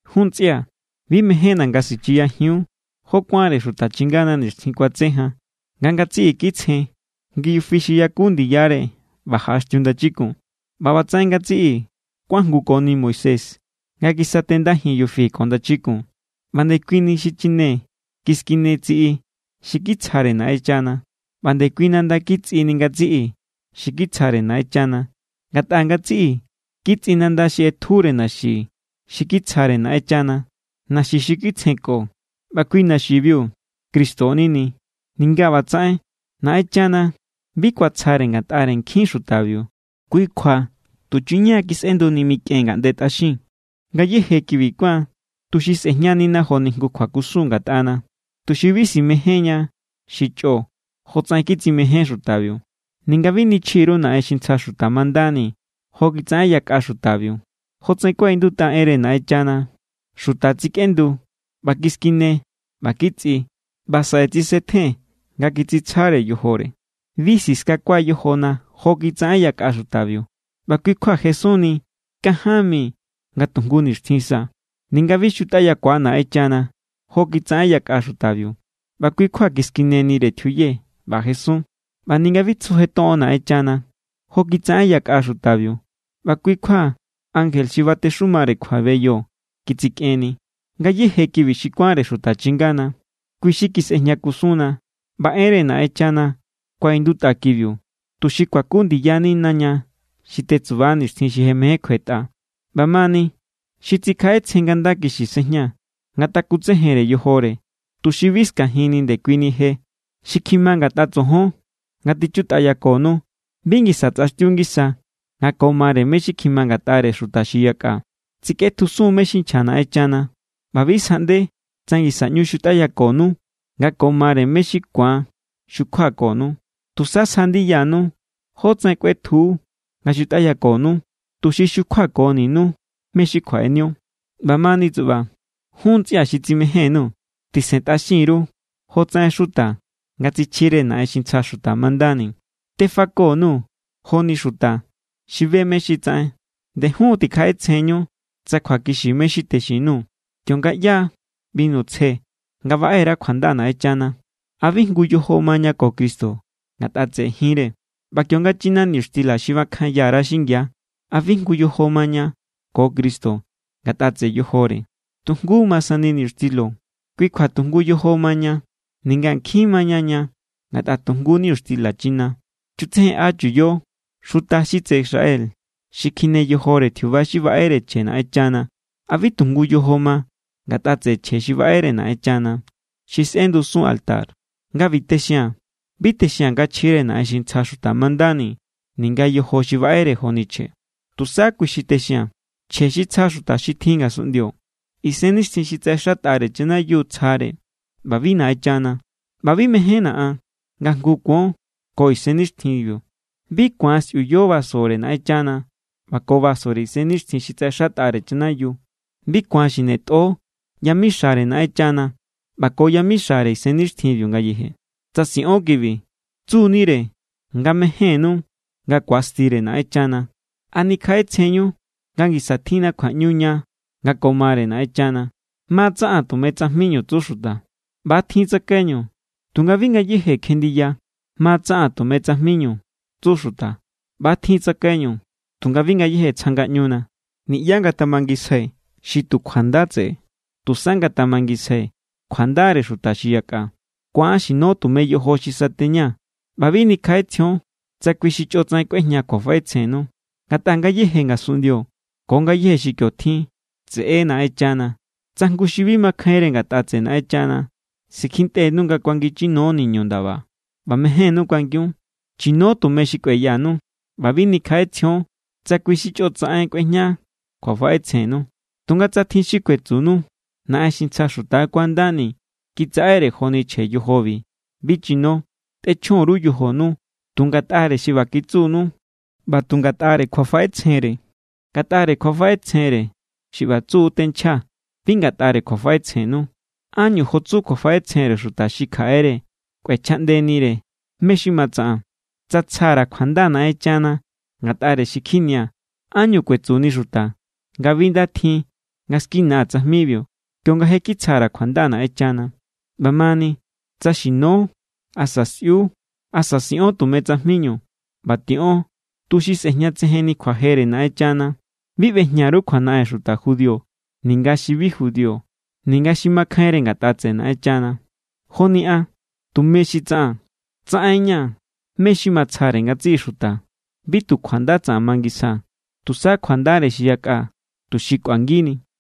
Jun ntsꞌia̱, bi mejénna̱ nga sichiyajiun jó kuánre xuta chingana nixtjin kuatse jan. Nga ngatsiꞌi kitsjen ngi yufi xi yaku ndiyare ꞌba jaꞌaxtiu ndachikun. ꞌBa ꞌbatsaꞌen ngatsiꞌi kuajngukoni Moisés nga kisatendajin yufi ko ndachikun. ꞌBa ndekuini xichine kiskinetsiꞌi xi kitsjare Naꞌenchana. ꞌBa ndekui nanda kitsꞌini ngatsiꞌi xi kitsjare Naꞌenchana. Ngatꞌa ngatsiꞌi kitsꞌi nanda xi ꞌetjure naxi xi kitsjare Naꞌenchana, naxi xi kitsjenko. ꞌBa kui naxibiu Cristo= nini. Ninga ꞌbatsaꞌen, Naꞌenchana bi kuatsjare ngatꞌare nkjin xutabiu, kui kjua tuchuña= kisꞌenduni mikꞌen ngaꞌnde tꞌaxin. Ngayéje kibi kuán tuxi sꞌejñanina joni jngu kjuakusun ngatꞌana, tuxi bi simejénña xi chꞌo, jotsaꞌen kitsimején xutabiu. Ninga bi nichji_ru naꞌen xi ntsja xuta mandani jo kitsaꞌen yakꞌa xutabiu. Jotsaꞌen kuaꞌindutꞌa enre Naꞌenchana: “Xuta tsikꞌendu ꞌba kiskine ꞌba kitsꞌi, ꞌba saꞌe tsisetjen nga kitsitsjare yojore.” Bi siskakua yojona jo kitsaꞌen yakꞌa xutabiu, ꞌba kui= kjua jesunni kanján mi nga tu jngu nixtjin sa. Ninga bi xutꞌayakua Naꞌenchana jo kitsaꞌen yakꞌa xutabiu, ꞌba kui= kjua kiskinenire tjiuye ꞌba jesun. ꞌBa ninga bi tsujetoꞌon Naꞌenchana jo kitsaꞌen yakꞌa xutabiu, ꞌba kui= kjua ankje xi batexumare kjuabeyo kitsikꞌenni. Ngayéje kibi xi kuánre xuta chingana, kui xi kisꞌejña kusunna. ꞌBa enre Naꞌenchana kuaꞌindutꞌa kibiu, tuxi kuaku ndiyanina ña xi tetsuba nixtjin xi je mején kjuetꞌa. ꞌBamani, xi tsikjaꞌetsjen nga nda kixi sejña, ngatakutsejenre yojore, tuxi bi skajinni ndekuini je. Xi kjima ngatꞌa tsojon nga tichutꞌayakonu bi ngisa tsꞌaxtiu ngisa nga ko mare mé= xi kjima ngatꞌare xuta xi yakꞌa. Tsikꞌetjusun= mé= xi nchja Naꞌenchana ꞌba bi sjaꞌnde tsa ngisa ꞌñu xutꞌayakonu nga ko mare mé= xi ku̱an xukjuakonu. Tusa sja ndiyanu jótsaꞌen kꞌuetju nga xutꞌayakonu, tuxi xukjuakoninu mé= xi kjuaꞌenio. ꞌBamani tsuꞌba, jun ntsꞌia̱ xi tsimején_nuu̱, tisentꞌaxin_ru jo tsaꞌen xuta nga tsichjire naꞌen xi ntsja xuta mandani. Tefako_nuu̱ joni xuta xi be mé= xi tsaꞌen. Nde jun= tikjaꞌetsjenñu tsa kjuakixi mé= xi texin_nuu̱. Kionga ꞌyáa binu tsje nga baꞌe_ra kjuanda Naꞌenchana, ¿a bi jngu yojo maña ko Cristo ngatꞌa tseꞌe jinre? ꞌBa kionga china niñuxtila xi bakjanya_ra xingia, ¿a bi jngu yojo maña ko Cristo ngatꞌa tseꞌe yojore? Tu jngu= ma sani niñuxtilo. Kui kjua tu jngu yojo maña, ninga nkjin maña ña. Ngatꞌa tu jngu niñuxtila china. Chutsejenꞌa chuyo xuta xi tseꞌe Israel. Xi kjine yojore tjiuba xi baꞌere chje Naꞌenchana, ¿a bi tu jngu yojo ma ngatꞌa tseꞌe chje xi baꞌere Naꞌenchana, xi sꞌendusun altar? Nga ꞌbi texia̱n, bi texia̱n nga chjire naꞌen xi ntsja xuta mandani, ninga yojo xi baꞌere joni chje. Tusa kui= xi texia̱n. Chje xi tsja xuta xi tjin ngasunꞌndio, isennixtjin xi tsaꞌexatꞌare chanayiu tsjare ꞌba bi Naꞌenchana. ꞌBa bi mejénna̱ an nga jngu kuon ko isennixtjinbiu. Bi ku̱an sꞌiuyo vasore Naꞌenchana ꞌba ko vasore isennixtjin xi tsaꞌexatꞌare chanayiu. Bi ku̱an xinetꞌo yamixare Naꞌenchana ꞌba ko yamixare isennixtjinbiu ngayeje. Tsa siꞌon kibi, tsunire nga mejénnu nga ku̱astire Naꞌenchana. ¿A nikjaꞌetsjenñu nga ngisa tjinna kjuaꞌñu ña nga ko mare Naꞌenchana? “Ma= tsaꞌaa̱n tume tsajminu”, tsu xuta. ꞌBa= tjin tsakaiñu, tunga bi ngayéje kjenndiya. “Ma= tsaꞌaa̱n tume tsajminu”, tsu xuta. ꞌBa= tjin tsakaiñu, tunga bi ngayéje tsja ngaꞌñuna. Niꞌyá ngatamangisjai xi tu kjuanda tseꞌe, tusa ngatamangisjai kjuandare xuta xi yakꞌa. Ku̱an xino tume yojo xi sateña ꞌba bi nikjaꞌetsjion tsa kui xi chꞌotsaꞌen kꞌuejña kjuafaꞌetsjennu. Ngatꞌa ngayéje ngasunꞌndio ko ngayéje xi kio tjin, tseꞌe= Naꞌenchana. Tsa jngu xi bi makjainre ngatꞌa tseꞌe Naꞌenchana sikjintꞌenu nga kuangin chino niñu ndaba ꞌba mejénnú kuangiun, chino tume xi kueyanu ꞌba bi nikjaꞌetsjion tsa kui xi chꞌotsaꞌen kꞌuejña kjuafaꞌetsjennu. Tunga tsa tjin xi kuetsunu: “Naꞌen xi ntsja xuta= kuandani kitsaꞌere joni chje yojobi”, bi chino. Tꞌechjon_ru yojonu tu ngatꞌare xi ꞌba kitsunu ꞌba tu ngatꞌare kjuafaꞌetsjenre. Ngatꞌare kjuafaꞌetsjenre xi ꞌba tsu tenchjaa̱, bi ngatꞌare kjuafaꞌetsjennu. ¿Ánñu jo tsu kjuafaꞌetsjenre xuta xi kjaꞌere kꞌuechjaꞌndenire mé= xi ma tsaꞌaa̱n? Tsa tsja_ra̱ kjuanda Naꞌenchana ngatꞌare xi kjinia̱, ¿ánñu kuetsuni xuta nga bi nda tjin nga skinaa̱ tsajmibiu kionga je kitsja_ra̱ kjuanda Naꞌenchana? ꞌBamani, tsa xino asa sꞌiu asa siꞌon tume tsajminu, ꞌba tiꞌon tuxi sꞌe̱jñatsejenni kjuajere Naꞌenchana. Bi ꞌbejña_ru kjuanaꞌen xuta judío ninga xi bi judío ninga xi makjainre ngatꞌa tseꞌe Naꞌenchana. Joni an, tume xi tsaꞌaa̱n, tsaꞌen=ña̱ mé= xi matsjare ngatsiꞌi xuta. Bi tu kjuanda tsaꞌan mangisjaa̱, tusa kjuandare xi yakꞌa, tuxi kꞌuangini.